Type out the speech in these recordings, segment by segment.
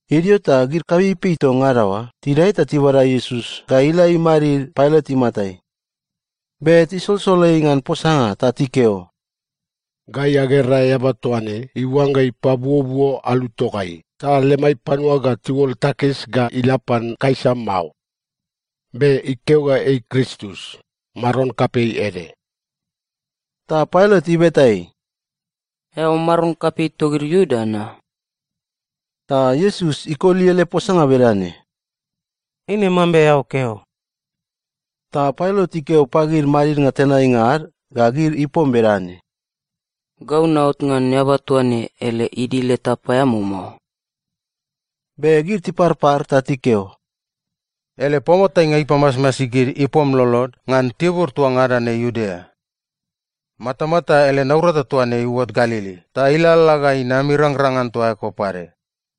Idio ta gid kapeipei toa ngada oa tidae ta tibada Iesus ga ila imadid Pailat imatai. Be tisolsol ei ngan posanga ta tikeo, “Gai agera eaba toa ne iuangga ipabuobuo alu togai ta lemai panua ga tiuol takis ga ila pan Kaisa mao. Be ikeo ga ei Kristus, maron kapei ede.” Ta Pailat ibeta ei, “Eao maron kapei togid Iuda na?” Ta Iesus ikoli ele posanga bedane, “Eine mambe eao keo.” Ta Pailat ikeo pagid madidnga tenainga ad ga gid ipom bedane, “Gau naot ngan eaba toa ne ele idil eta paeamao mao.” Be gid tiparpar ta tikeo, “Ele paoatainga ipamasmasi gid ipom lolod ngan tibur toa ngada ne Iudea. Matamata ele naurata toa ne iuot Galili ta ilalala ga inam irangrang ngan toa eko pade.”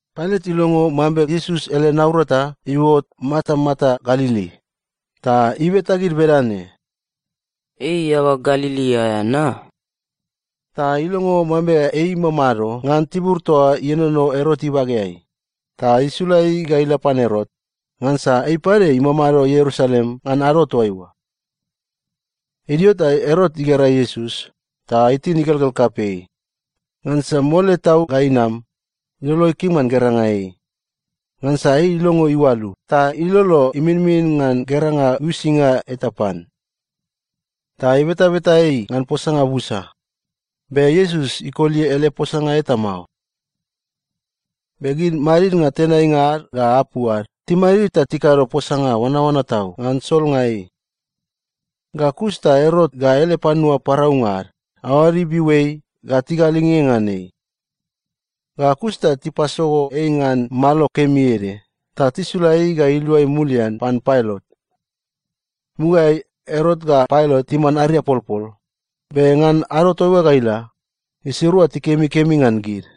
Pailat ilongo mambe Iesus ele naurata iuot matamata Galili, ta ibeta gid bedane, “Ei eaba Galili aea na?” Ta ilongo mambe ei imamado ngan tibur toa ienono Erot ibageai, ta isula ei ga ila pan Erot, ngansa ei pade imamado Ierusalem ngan ado toaiua. Idio ta Erot igera Iesus, ta itin igelgel kapei, ngansa mole tau ga inam, ilolo ikim ngan geranga ei. Ngansa ei ilongo iualu ta ilolo iminmin ngan geranga uisinga eta pan. Ta ibetabeta ei ngan posanga busa, be Iesus ikoli ele posanga eta mao. Be gid madidnga tenainga ad ga apu ad timadid ta tikado posanga oanaoana tau ngan solnga ei. Ga kus ta Erot ga ele panua paraunga ad aoad ibiu ei ga tigalinge ngan ei. Ga kus ta tipasogo ei ngan malo kemi ede ta tisula ei ga iluai mulian pan Pailat. Mugaeai, Erot ga Pailat timan ariapolpol, be ngan ado toaiua ga ila, gisirua tikemikemi ngan gid.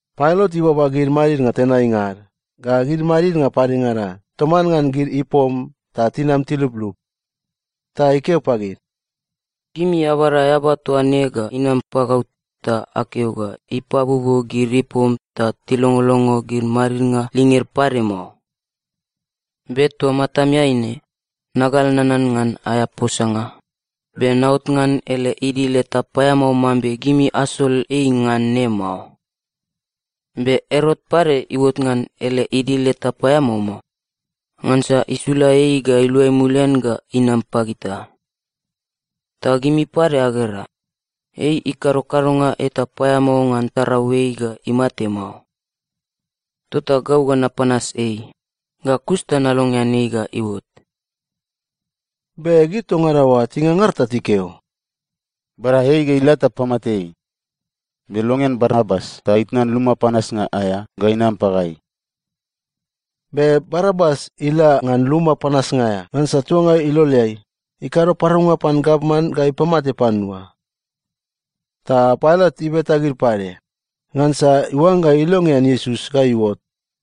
Pailat ibaba gid madidnga tenainga ad, ga gid madidnga padengada, toman ngan gid ipom ta tinam tiluplup, ta ikeo pagid, “Gimi abada eaba toa ne ga inam pagau ta akeo ga ipabuobuo gid ipom ta tilongolongo gid madidnga linged pade mao. Be toa matamiai ne, nagal nanan ngan aea posanga, be naot ngan ele idil eta paeamao mambe gimi asol ei ngan ne mao. Be Erot pade iuot ngan ele idil eta paeamao mao, ngansa isula ei ga iluai mulian ga inam pagita. Ta gimi pade agera, ei ikado kadonga eta paeamao ngan tarau ei ga imate mao. Tota gau ga napanas ei, ga kus ta nalongean ei ga iuot.” Be gid toa ngada oa tingangar ta tikeo, “Bada ei ga ila ta pamate ei! Be longean Barabas ta itnan luma panasnga aea ga inam pagai!” Be Barabas ila ngan luma panasnga aea ngansa tuanga iloleai, ikado paraunga pan gavman ga ipamate panua. Ta Pailat ibeta gid pade, ngansa iuangga ilongean Iesus ga iuot.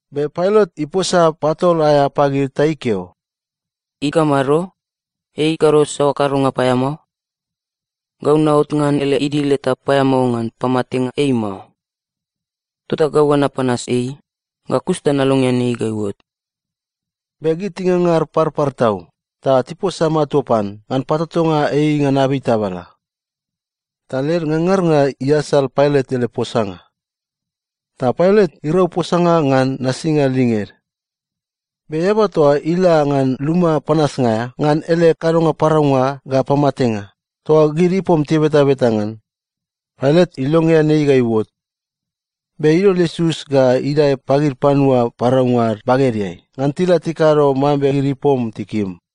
Be Pailat iposa patol aea pagid ta ikeo, “Ikamado? Ei ikado saoa kadonga paeamao? Gau naot ngan ele idil eta paeamao ngan pamatenga ei mao. Tota gau ga napanas ei, ga kus ta nalongean ei ga iuot.” Be gid tingangar parpar tau ta tiposa matua pan ngan patotonga ei ngan abei tabala. Ta led ngangarnga iasal Pailat ele posanga. Ta Pailat irau posanga ngan nasinga linged. Be eaba toa ila ngan luma panasnga aea ngan ele kadonga paraunga ga pamatenga, toa gid ipom tibetabeta ngan, Pailat ilongean ei ga iuot. Be idol Iesus ga idae pagid panua paraunga ad bagedeai ngan tila tikado mambe gid ipom tikim.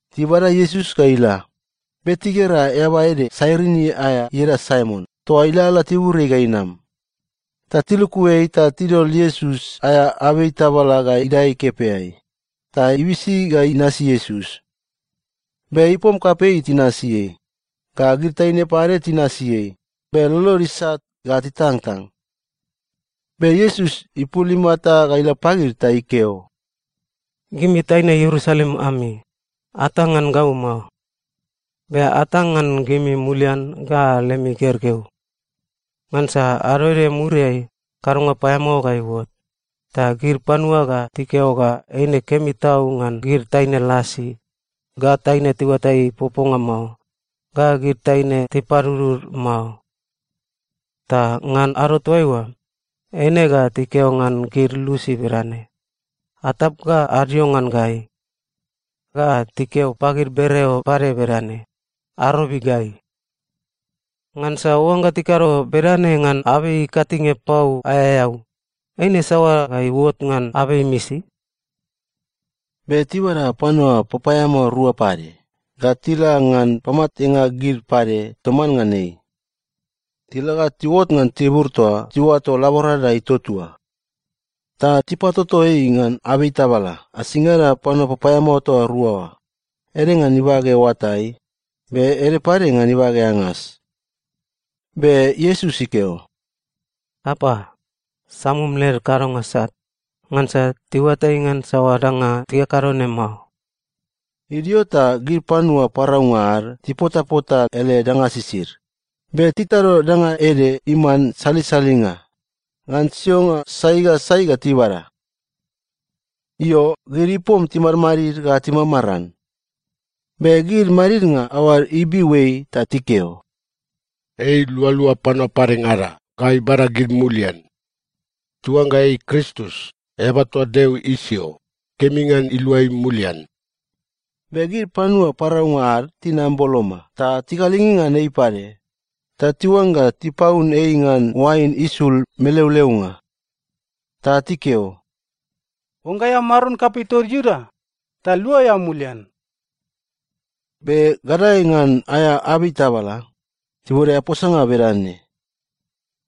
Tibada Iesus ga ila, be tigera eaba ede Sairini aea ieda Saimon toa ilalala tiburiai ga inam, ta tiluku ei ta tidol Iesus aea abei tabala ga idae ikepeai, ta ibisi ga inasi Iesus. Be ipom kapei tinasi ei, ga gid taine pade tinasi ei be lolod isat ga titangtang. Be Iesus ipul imata ga ila pagid ta ikeo, “Gimi taine Ierusalem ami, atang ngan gau mao. Be atang ngan gimi mulian ga lemi gergeu. Ngansa ado ede muriai, kadonga paeamao ga iuot, ta gid panua ga tikeo ga eine kemi tau ngan gid taine lasi, ga taine tiuatai poponga mao, ga gid taine tipadudud mao. Ta ngan ado toaiua, “‘Eine ga tikeo ngan gid lusi bedane, “Atap ga adio ngan gai!” Ga tikeo pagid bereo pade bedane, “Arobi gai!” ’ Ngansa oangga tikado bedane ngan abei ikatinge pau aea eau, eine saoa ga iuot ngan abei imisi?” Be tibada panua papaeamao rua pade ga tila ngan pamatenga gid pade toman ngan ei. Tila ga tiuot ngan tibur toa tiuato Laborada Ituatua, ta tipatoto ei ngan abei tabala asingada panua papaeamao toa rua oa, ede ngan ibage oatai, be ede pade ngan ibage angas. Be Iesus ikeo, “Apa, samum led kadonga sat, ngansa tiuatai ngan saoa danga tikakado ne mao.” Idio ta gid panua paraunga ad tipotapota ele danga sisid, be titado danga ede iman salisalinga ngan sionga sai ga sai ga tibada. Io, gid ipom timadmadid ga timamaran. Be gid madidnga aoad ibiu ei ta tikeo, “Ei ilualua panua padengada ga ibada gid mulian. Ta oangga ei Kristus, eaba toa Deo isio, kemi ngan ilua ei mulian.” Be gid panua paraunga ad tinam boloma ta tigalinge ngan ei pade, ta tiuangga tipaun ei ngan oain isul meleoleonga. Ta tikeo, “Oangga eao maron kapei togid Iuda, ta lua eao mulian.” Be gadae ngan aea abei tabala, tibode aea posanga bedane,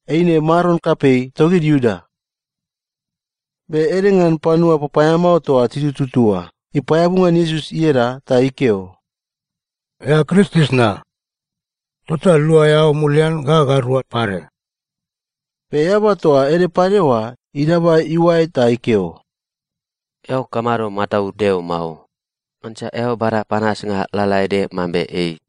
“Eine maron kapei togid Iuda.” Be ede ngan panua papaeamao toa titututu oa ipaeabu ngan Iesus ieda ta ikeo, “Eao Kristus na? Tota lua eao mulian ga gairua pade!” Be eaba toa ede pade oa idaba iuae ta ikeo, “Eao kamado mataud Deo mao? Ngansa eao bada panasnga lalaede mambe ei.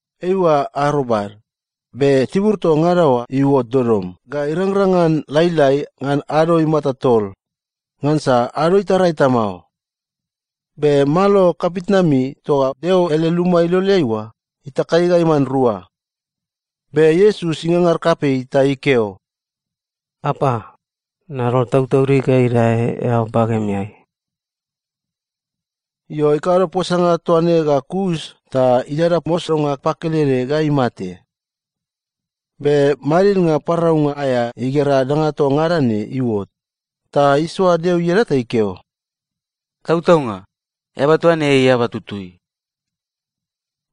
Eiua arobad, be tibur toa ngada oa iuot dodom ga irangrang ngan lailai ngan ado imata tol, ngansa ado itara eta mao. Be malo kapitnami toa Deo ele luma iloleai oa itakai ga iman rua. Be Iesus ingangar kapei ta ikeo, “Apa, nadol tautaudig ga idae eao bagemeai.” Io, ikado posanga toa ne ga kus ta idada mosonga pakelede ga imate. Be madidnga paraunga aea igera danga toa ngada ne iuot, ta isoa Deo ieda ta ikeo, “Tautaunga, eaba toa ne ei eaba tutui.”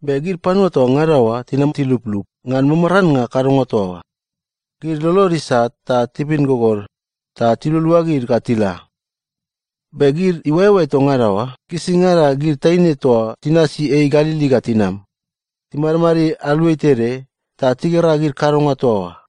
Be gid panua toa ngada oa tinam tiluplup ngan mamarannga kadonga toa oa, gid lolod isat ta tibin gogod ta tilualuagid ga tila. Be gid iuaeoae toa ngada oa gisingada gid taine toa tinasi ei Galili ga tinam, timadid aluai tede ta tigera gid kadonga toa oa.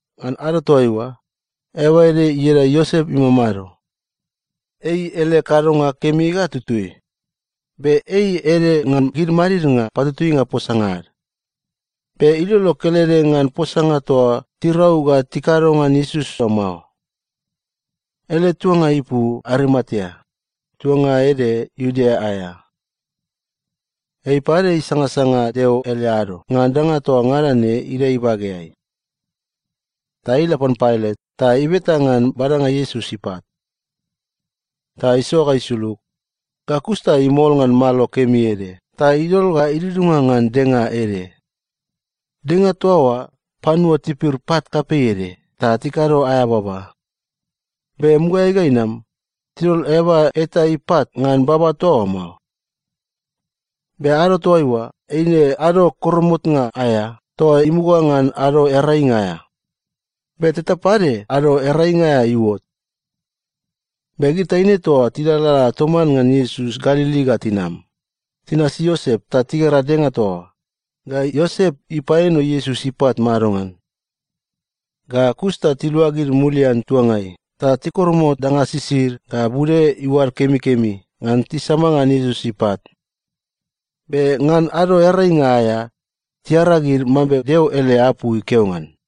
Ngan ado toaiua, eaba ede ieda Iosep imamado. Ei ele kadonga kemi ga tutui, be ei ede ngan gid madidnga patutuinga posanga ad. Be ilolo kelede ngan posanga toa tirau ga tikado ngan Iesus oa mao. Ele tuanga ipu Arimatea, tuanga ede Iudea aea. Ei pade isangasanga Deo ele ado ngan danga toa ngada ne idae ibageai. Ta ei ila pan Pailat ta ibeta ngan badanga Iesus ipat. Ta isoa ga isulug, ga kus ta imol ngan malo kemi ede ta idol ga idudunga ngan denga ede. Denga toa oa panua tipir pat kapei ede ta tikado aea baba. Be mugaeai ga inam, tidol eaba eta ipat ngan baba toa oa mao. Be ado toaiua, eine Ado Koromotnga aea toa imuga ngan Ado Earainga aea, be teta pade Ado Earainga aea iuot. Be gid taine toa tilalala toman ngan Iesus Galili ga tinam, tinasi Iosep ta tigera denga toa oa ga Iosep ipaeno Iesus ipat madongan. Ga kus ta tiluagid mulian tuangai ta tikoromot danga sisid ga bude iuad kemikemi ngan tisama ngan Iesus ipat. Be ngan Ado Earainga aea tiaragid mambe Deo ele apu ikeo ngan.